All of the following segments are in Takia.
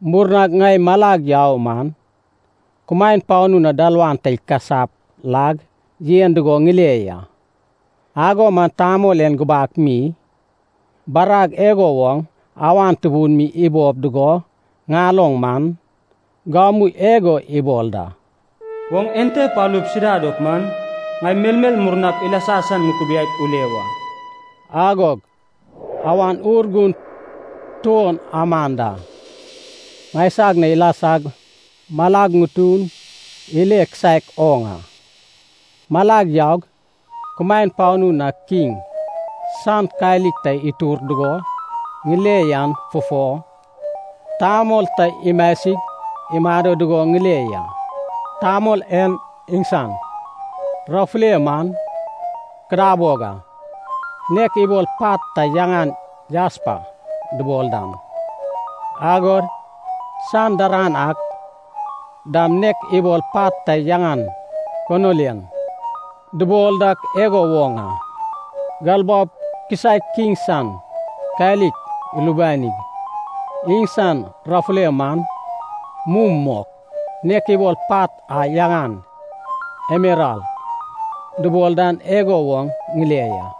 Murnag ŋai malag yau man, kumaen panu na dalawan ta ikasap lag yen dugo ŋile ya. Ago man tamol en gubak mi, barag igo woŋ awan tubun mi ibob dugo ŋaloŋ man, gamu igo ibol da, “Oŋ ente palup sida dop man, ŋai melmel murnap ilasa san ŋukubiaip ule wa.” Agog Awan Urgun tuon aman da ŋaisag na ilasag malag ŋutun ile kisaek oŋ a. Malag yaug kumaen panu na kiŋ san kalik ta itur dugo ŋile yan fufo, Tamol ta imasig imado dugo ŋile ya. Tamol en iŋsan rafulei man kadabog a, nek ibol pat ta yaŋan jaspa dubol dan, agod san daran ak dam nek ibol pat ta yaŋan konilian dubol dak igo woŋ a. Galbaob kisaek kiŋ san kalik ilubanig, iŋsan rafulei man mum mok, nek ibol pat a yaŋan emeral dubol dan igo woŋ ŋile ya.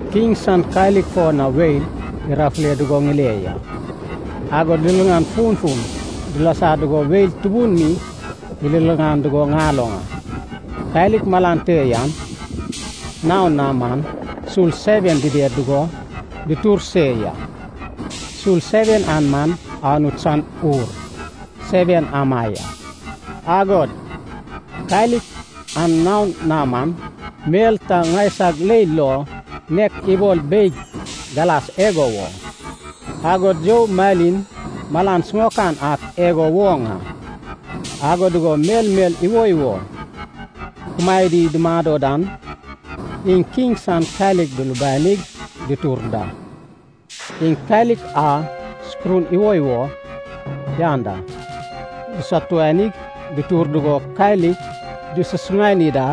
Kiŋ san kalik fo na weil irafule dugo ŋile ya, agod liliŋan funfun dilasa dugo weil tubun mi iliŋan dugo ŋaloŋ a. Kalik malan te yan naon na man sul seven dided dugo dutur se ya. Sul seven an man Anut san Ur seven ama ya. Agod kalik an naon na man, mel ta ŋaisag leil lo nek ibol beig galas igo woŋ, agod you malin malan siŋaokan ak igo woŋ a. Ago dugo melmel iwoiwo kumaedi dumado dan, iŋ kiŋ san kalik dulubanig dutur da. Iŋ kalik a sukurun iwoiwo yan da dusatuanig dutur dugo kalik disasuŋani da.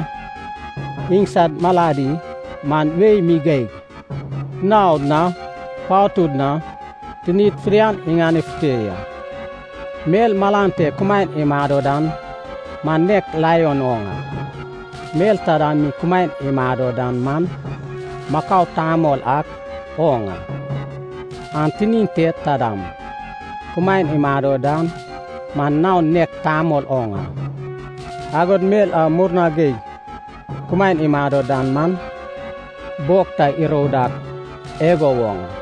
Iŋsad maladi man wei mi geig, naod na patud na tinid fidian iŋanefute ya. Mel malan te kumaen imado dan man nek laion oŋ a. Mel taida mi kumaen imado dan man, makau tamol ak oŋ a. An tinin te taidam, kumaen imado dan man naon nek tamol oŋ a. Agod mel a murna geig kumaen imado dan man, bog ta irou dak igo woŋ a.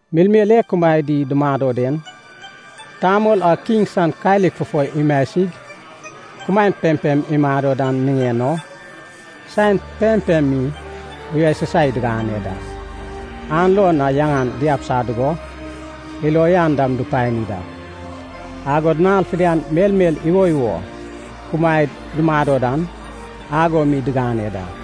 Melmel e kumaed dumado den, Tamol a kiŋ san kalik fufo imasig kumaen pempem imado dan niŋen o, saen pempem mi uyasusai digane da. An lo na yaŋan diabisa dugo, ilo uyan dam dupani da. Agod nal fidian melmel iwoiwo kumaed dumado dan, ago mi digane da.